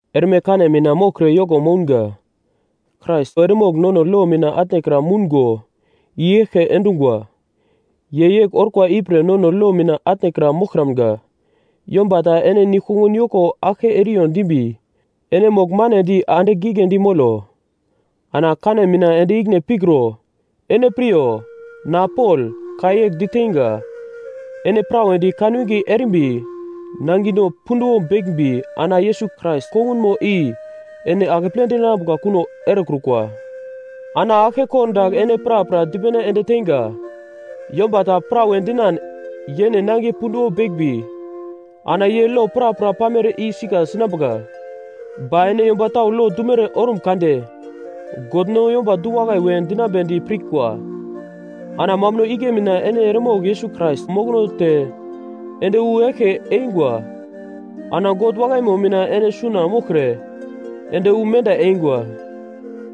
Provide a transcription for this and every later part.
Erme kane mina moglkre yoko mounga. Krais eremogl nono lo mina atnekra moungo i-eglke endungwa. Ye yegl orkwa ipre nono lo mina atnekra moglkramga. Yomba ta ene nigl-kongun yoko aglke eriyo dimbi ene mogl manedi andigl giglendi molo. Ana kane mina ende ikine pikro. Ene piryo! Na Pol, ka yegl diteinga, ene prawedi kanwinge erimbi nangino punduwo beglmbi ana Yesus Krais kongunmo i ene akeple dinambuka kuno erekrukwa. Ana aglke kordagl ene prapra dipene ende teinga, yomba ta prawe dinan yene nangiye punduwo beglmbi ana ye lo prapra pamere i sika sinambuka. Ba ene yomba tau lo dumere ormun kade, God no yomba du-wakai we dinambedi pirkwa. Ana mambuno igle mina ene eremogl Yesus Krais mokono te ende wu eglke eingwa. Ana God wakaimo mina ene suna moglkre ende wu menda eingwa.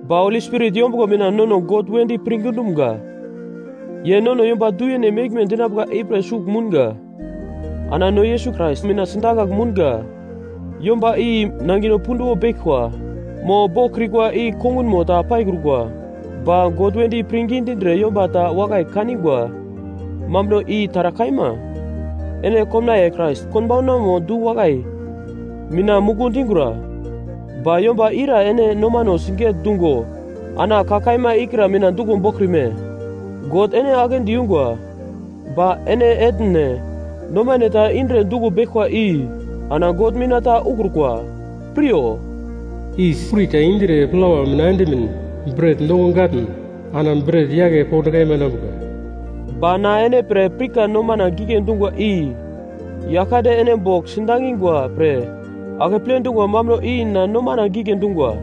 Ba Holi Spirit yombuglo mina nono God wedi pirngi dumga, ye nono yomba du-yene meglme dinambuka ipre sugl mounga. Ana no Yesus Krais mina sidakagl mounga yomba i nangino punduwo beglkwa mo boglkrikwa i kongunmo ta paikrukwa, ba God wedi pirngi dindre yomba ta wakai kaningwa mambuno i taragl kaima. Ene komnaiye Krais konbaunamo du-wakai mina muku dingura. Ba yomba ira ene nomano siget-dungo ana ka kaima ikra mina duglo boglkrime? God ene aglendi yungwa, ba ene etne nomane ta indre duglo beglkwa i ana God mina ta ukrukwa. Piryo, “Yis kuri ta indre plawa mina endimin bret noko gatn ana bret yake pond kaima enambuka.” Ba na ene pre pirka nomana gigle dungwa i Yaglkande ene bogl sidangingwa pre akeple dungwa mambuno i na nomana gigle dungwa.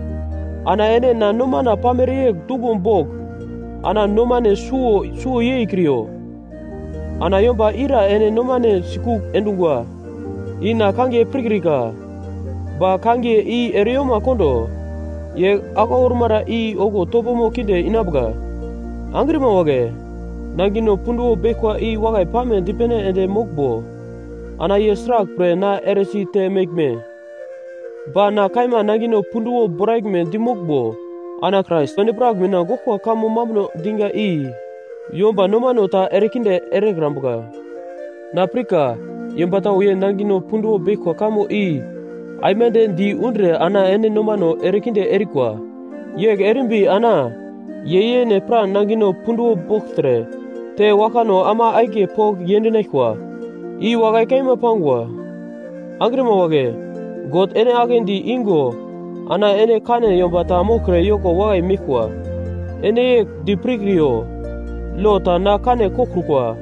Ana ene na nomana pamere yegl duglo bogl ana nomane suwo suwo yeikriyo. Ana yomba ira ene nomane sikugl endungwa i na kangiye pirkrika, ba kangiye i ereyoma kondo. Ye aglau ormara i okuwo topomo kinde inambuka. Angrima wagle, nangino punduwo beglkwa i wakai pame dipene ende moglmbo, ana ye sraglpre na eresi te meglme? Ba na kaima nangino punduwo boraglme dimoglmbo, ana Krais endi-prak mina goglkwa kamo mambuno diga i yomba nomano ta erekinde erekrambuka. Na pirka yomba tau ye nangino punduwo beglkwa kamo i aimande di undre ana ene nomano erekinde erikwa. Yegl erimbi ana ye yene pra nangino punduwo bogltre te waglkano ama akiye pogl yendinaglkwa. I wakai kaima pangwa. Angrima wagle, God ene aglendi igo ana ene kane yomba ta moglkre yoko wakai meglkwa. Ene yegl di pirkriyo, lo ta na kane koglkrukwa,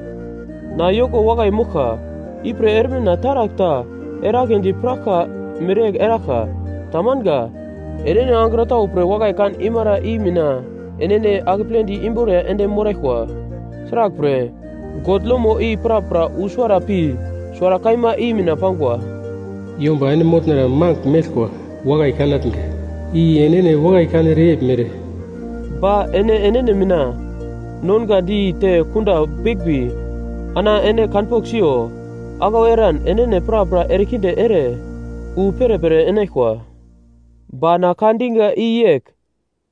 na yoko wakai moglka, ipre erme na taragl ta eragledi piraglka mereyegl eraglka. Tamanga. Enene angro tau pre wakai kan imara i mina enene akepledi imboriya ende moraglkwa. Sraglpre, God lomo i prapra wu suwara pi suwara kaima i mina pangwa, “Yomba ene motnara magl meglkwa wakai kanatnga, i enene wakai kanere yeglmere.” Ba ene enene mina nongadi te kunda beglmbi, ana ene kanpogl siyo, aglau eran enene prapra erekinde ere wu perepere enaglkwa. Ba na ka diga i yegl: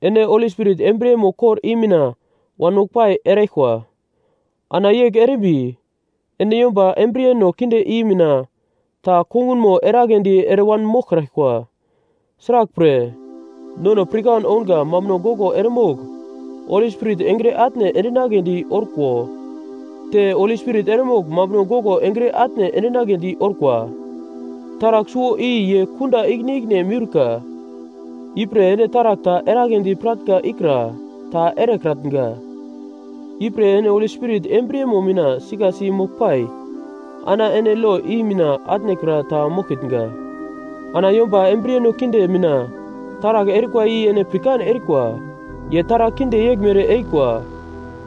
Ene Holi Spirit embriyemo kor i mina wanmoglpai eraglkwa, ana yegl erimbi, ene yomba embriyeno kinde i mina ta kongunmo eragledi ere wanmoglkraglkwa. Sraglpre, nono pirkan ounga mambuno goglo eremogl Holi Spirit engre atne endinagledi orko te, Holi Spirit eremogl mambuno goglo engre atne endinagledi orkwa. Taragl suwo i ye kunda ikine-ikine meurka. Ipre ene taragl ta eragledi piratnga ikra ta erekratnga. Ipre ene Holi Spirit embriyemo mina sikasi moglpai, ana ene lo i mina atnekra ta moglkitnga. Ana yomba embriyeno kinde mina taragl erikwa i ene pirkan erikwa. Ye taragl kinde yeglmere erikwa: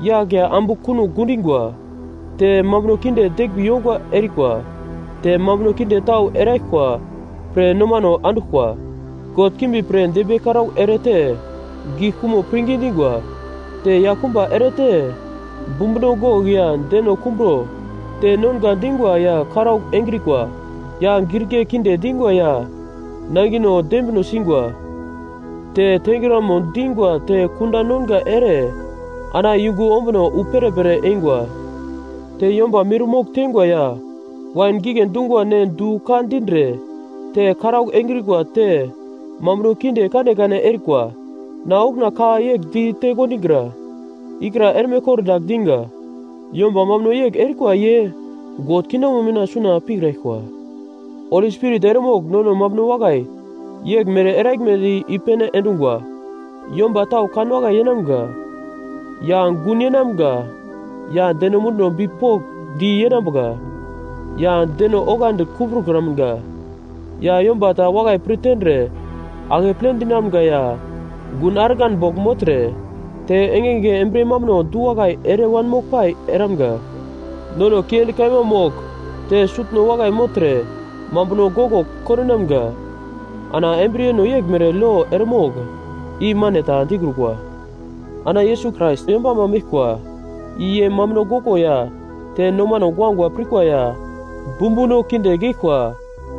Yagl ya ambu kunogl gidingwa, te mambuno kinde deglmbi yongwa erikwa, te mambuno kinde tau eraglkwa pre nomano anduglkwa, god kimbi pre dembiye karaugl ere te gigl kumo pirngi dingwa. Te yaglkumba erete, bumbuno gogl ya deno kumbro te nonga dingwa ya karaugl engrikwa ya girigle kinde dingwa ya nangino dembino singwa, te tengramo dingwa te kunda nonga ere ana yungu ombuno wu perepere eingwa. Te yomba mirmogl tengwa ya wain gigle dungwa ne du ka dindre te karaugl engrikwa te mambuno kinde kanekane erikwa. Na okuna ka yegl ditekondigra ikra erme kordagl diga. Yomba mambuno yegl erikwa ye God kingdomo mina suna pikraglkwa. Holi Spirit eremogl nono mambuno wakai yeglmere eraglmedi i-pene endungwa. Yomba tau kanwakai yenamga, ya gun yenamga ya deno munduno bipokndi yenambuka ya deno oglandi kumbrokramga ya yomba ta wakai pir tendre akeple dinamga ya gun argan bogl mogltre, te engenge embriye mambuno du-wakai ere wanmoglpai eramga, nono kiendi kaima mogl te sutno wakai mogltre mambuno goglo kondinamga. Ana embriyeno yeglmere lo eremogl i mane ta dikrukwa. Ana Yesus Krais yombama meglkwa, i ye mambuno goglo ya te nomano guagua pirkwa ya bumbuno kinde geglkwa,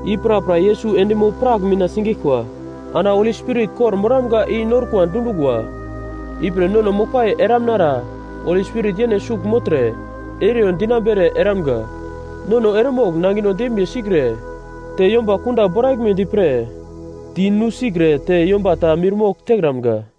i prapra Yesus endimo-prak mina sigeglkwa. Ana Holi Spirit kor-moramga i norkwa dundungwa, ipre nono moglpai eramnara Holi Spirit yene sugl mogltre eriyo dinambere eramga. Nono eremogl nangino dembiye sikre te yomba kunda boraglmedi pre di nusikre te yomba ta mirmogl tekramga.